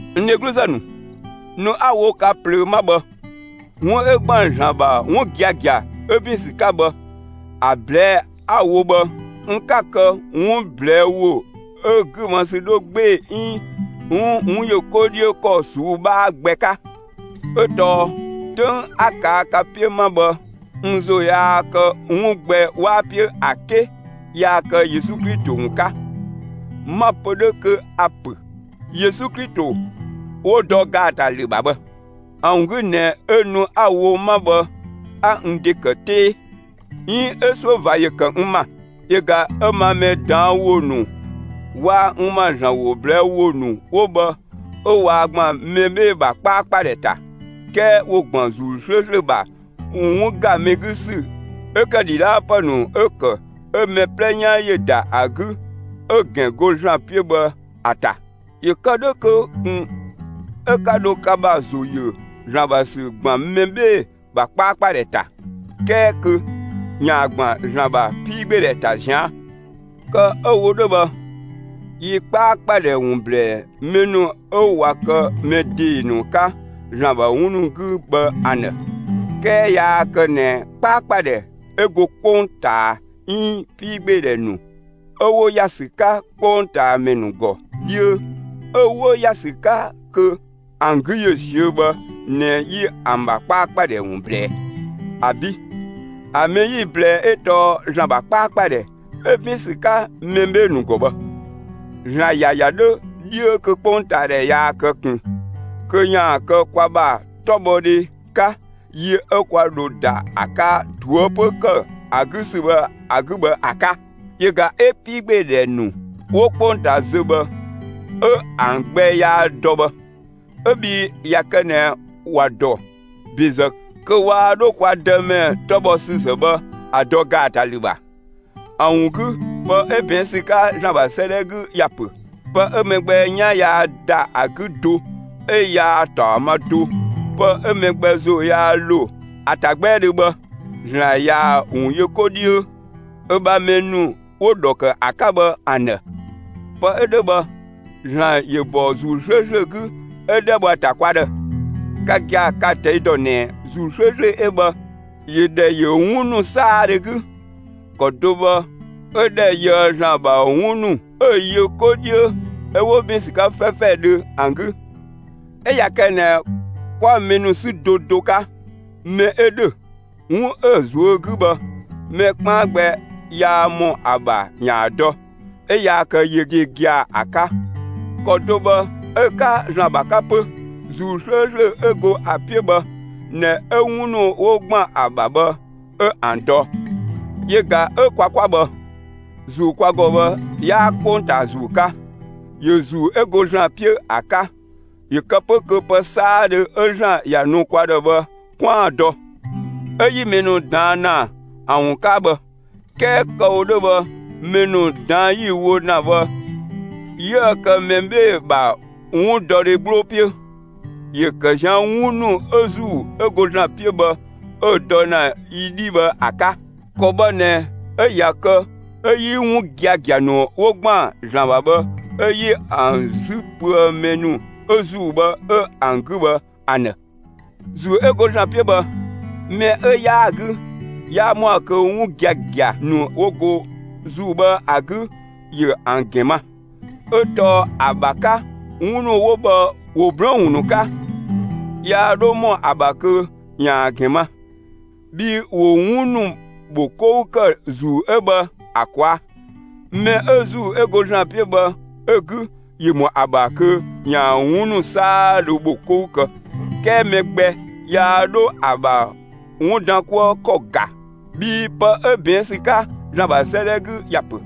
N dhegluzë ‑nu, nu 'a‑ wo ka ꞊plöö 'ma bhë, 'wun 'ö ‑gban ‑Zlan ‑bha 'wun giagia 'ö ‑bin ‑sü 'ka bhë, ‑a ꞊blɛɛ'‑ 'a‑ wo bhë, n 'ka‑ kë 'wun ꞊blɛɛ' ‑wo 'ö‑ 'gü ma ‑sü 'dhö 'gbee‑ 'iin 'wun ‑yö 'ko 'dhiö ‑kɔ ꞊suu'‑ 'bhaa gbɛ 'ka; 'ö tɔɔ 'töng 'a ꞊kaa' ka 'piö 'ma bhë, n ‑zo yaa kë 'wun gbɛ 'waa 'piö ‑a 'ke yaa kë Yesu Klito ‑wun 'ka. 'Ma‑ pö 'dhö kö a‑ ‑pö Yesu Klito 'wo‑ dɔ ‑gaatalü ‑bha bhë. ‑A ‑wun 'gü ꞊nɛ 'ö nu 'a‑ wo 'ma bhë 'a n ‑de ‑kë 'tee 'iin 'ö 'suö ꞊va ‑yö ‑kë n ‑ma. Yö ꞊ga 'ö ma mɛ ꞊daan' ‑wo ‑nu waa‑ n ‑ma ‑Zlan ‑wo ꞊blɛɛ' ‑wo ‑nu 'wo bhë 'ö waa ‑gban mɛ 'bhee‑ ‑bha 'kpaakpadhɛ ‑ta, 'kɛɛ 'wo ‑gban ‑Zuu 'slööslö ‑bha 'wun ‑ga mɛ 'gü ‑sü 'ö ‑kë ‑dhidhaapë ‑nu 'ö ‑kë 'ö mɛ 'plɛ 'yan ‑yö ‑da ‑a 'gü 'ö‑ ‑gɛn go ‑Zlan 'piö bhë ‑a ‑ta. ‑Yö kë 'dhö kö ꞊kun 'ö 'ka dho ka ‑bha ‑zo ‑yö ‑Zlan ‑bha ‑sü ‑gban mɛ 'bhee‑ ‑bha 'kpaakpadhɛ ‑ta 'kɛɛ kö ‑yaan ‑gban ‑Zlan ‑bha 'piigbeedhɛ ‑ta ꞊zian'. Kë 'ö‑ wo 'dhö bhë, yi 'kpaakpadhɛ ‑wun ‑blɛɛ mɛ ‑nu 'ö ꞊wa kë mɛ ‑dee ‑nu 'ka ‑Zlan ‑bha 'wun ‑nu 'gü bhë ‑an ‑dhë. 'Kɛɛ yaa kë ꞊nɛ 'kpaakpadhɛ 'ö go 'kpongtaa 'iin 'piigbeedhɛ ‑nu 'ö 'wo ‑ya ‑sü 'ka 'kpongtaamɛ ‑nu ‑gɔ 'dhiö 'ö 'wo ‑ya ‑sü 'ka kö ‑an 'gü ‑yö ꞊siö'‑ bhë ꞊nɛ 'yi ‑an ‑bha 'kpaakpadhɛ ‑wun ꞊blɛɛ. ‑Abi'; ‑a mɛ 'yi‑ ꞊blɛɛ 'ö tɔɔ ‑Zlan ‑bha 'kpaakpadhɛ 'ö ‑bin ‑sü 'ka mɛ 'bhee‑ ‑nu ‑gɔ bhë; ‑Zlan ‑ya ‑ya 'dhö 'dhiö kö 'kpongtaadhɛ yaa kë ꞊kun kö ‑yaan kë kwa ‑bha 'tɔbhɔdhe 'ka yi 'ö 'kwa dho ‑da ‑a 'ka ꞊toëpö ‑kë ‑a 'gü ‑sü bhë ‑a 'gü bhë ‑a 'ka. Yö ꞊ga 'ö 'piigbeedhɛ ‑nu 'wo 'kpongtaa zö bhë 'ö ‑an gbɛ yaa‑ dɔ bhë; 'ö bhii ꞊ya kë ꞊nɛ ‑wa ‑dɔ ‑bezë, kö waa 'dho kwa Dëmɛ 'tɔbhɔsüzë bhë, ‑a dɔ ‑gaatalü ‑bha. ‑A ‑wun 'gü, pë 'ö ꞊bɛɛn' ‑sü 'ka ‑Zlan ‑bha 'sëëdhɛ 'gü ‑ya ‑pö: Pë 'ö mɛ gbɛ 'yan yaa ‑da ‑a 'gü do, 'ö yaa‑ ‑taɔ ma do, pë 'ö mɛ gbɛ ‑zo yaa ‑lo ‑a ‑ta 'gbɛɛdhö bhë, ‑Zlan ꞊yaa‑ ‑wun yö 'ko 'dhiö ö ‑bha mɛ ‑nu 'wo‑ ‑dhɔ ‑kë ‑a 'ka bhë ‑an ‑dhë. Pë 'ö 'dhö bhë, ‑Zlan ‑yö bɔ ‑Zuu 'slööslö 'gü 'ö 'dhɛ bho ‑a ‑ta kwa ‑dhë; ka gia‑ ka‑ ꞊tɛi' ‑dɔ ꞊nɛ ‑Zuu 'slööslö 'ö bhë ‑yö ‑dhɛ ‑yö 'wun ‑nu 'saadhö 'gü; ‑kɔ do bhë 'ö ‑dhɛ yöë ‑Zlan ‑bha 'wun ‑nu 'ö‑ yö 'ko 'dhiö 'ö 'wo ‑bin ‑sü 'ka 'fɛfɛdhö ‑an 'gü. 'Ö ꞊ya kë ꞊nɛ 'kwa mɛ ‑nu 'sü do do 'ka, mɛ 'ö ‑dhö, 'wun 'ö‑ ꞊zuö' 'gü bhë, mɛ 'kpaan gbɛ yaa ‑mɔ ‑a ‑bha ‑yaan dɔ, 'ö yaa kë yö ‑de gia‑ ‑a 'ka, ‑kɔ do bhë 'ö‑ 'ka ‑Zlan ‑bha 'ka 'pö; ‑Zuu 'slööslö 'ö go ‑a 'piö bhë ꞊nɛ 'ö 'wun ‑nu 'wo ‑gban ‑a ‑bha bhë 'ö ‑an dɔ. Yö ꞊ga 'ö kwa 'kwa bhë, ‑Zuu kwa ‑gɔ bhë, 'yaa 'kpongtaa ‑zuu 'ka. ‑Yö ‑Zuu 'ö go ‑Zlan 'piö ‑a 'ka ‑yö kë 'pö kö pë 'saadhö 'ö ‑Zlan ‑ya nu kwa ‑dhë bhë 'kwaan‑ dɔ. 'Ö 'yi mɛ ‑nu ꞊daan' ‑na ‑an ‑wun 'ka bhë; 'kɛɛ kë‑ wo 'dhö bhë mɛ ‑nu ꞊daan' 'yi‑ wo ‑na bhë 'yiëë‑ kë mɛ 'bhee‑ ‑bha 'wundɔdhe 'gbloo 'piö; ‑yö ‑kë ꞊zian' 'wun ‑nu 'ö ‑Zuu 'ö go ‑Zlan 'piö bhë 'ö‑ dɔ ‑na yi 'dhii bhë ‑a 'ka. ‑Kɔ bhë ꞊nɛ 'ö ꞊ya kë 'ö 'yi 'wun giagia ‑nu 'wo ‑gban ‑Zlan ‑bha bhë 'ö 'yi ‑an 'zü pöë mɛ ‑nu 'ö ‑Zuu bhë 'ö ‑an 'gü bhë ‑an ‑dhë. ‑Zuu 'ö go ‑Zlan 'piö bhë, mɛ 'ö 'yaa‑ 'gü, yaa ‑mɔa kö 'wun giagia ‑nu 'wo go ‑Zuu bhë ‑a 'gü ‑yö ‑an ‑gɛn ma, 'ö tɔɔ ‑a ‑bha 'ka 'wun ‑nu 'wo bhë ‑wo 'blɔɔn‑ ‑wun ‑nu 'ka; yaa 'dho ‑mɔ ‑a ‑bha kö ‑ya ‑gɛn ma, bhii ‑wo 'wun ‑nu ‑bho 'kou ‑kë ‑Zuu 'ö bhë ‑a ꞊kwaa'. Mɛ 'ö ‑Zuu 'ö go ‑Zlan 'piö bhë 'ö‑ 'gü, ‑yö ‑mɔ ‑a ‑bha kö ‑yaan 'wun ‑nu 'saadhö ‑bho 'kou kë, 'kɛɛ mɛ gbɛ yaa 'dho ‑a ‑bha 'wun ‑dan 'kuë ‑kɔ ‑ga. Bhii pë 'ö ꞊bɛɛn' ‑sü 'ka ‑Zlan ‑bha 'sëëdhɛ 'gü ‑ya ‑pö: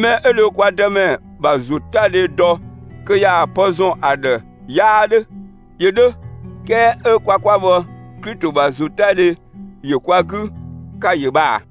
Mɛ 'ö dhö kwa Dëmɛ ‑bha ‑zotadhe dɔ kö ‑yaan pë ‑zɔn ‑a ‑dhë 'yaa 'dhö. ‑Yö 'dhö, 'kɛɛ 'ö kwa 'kwa bhë, Klito ‑bha ‑zotadhe ‑yö kwa 'gü; ka‑ ‑yö bhë ꞊a?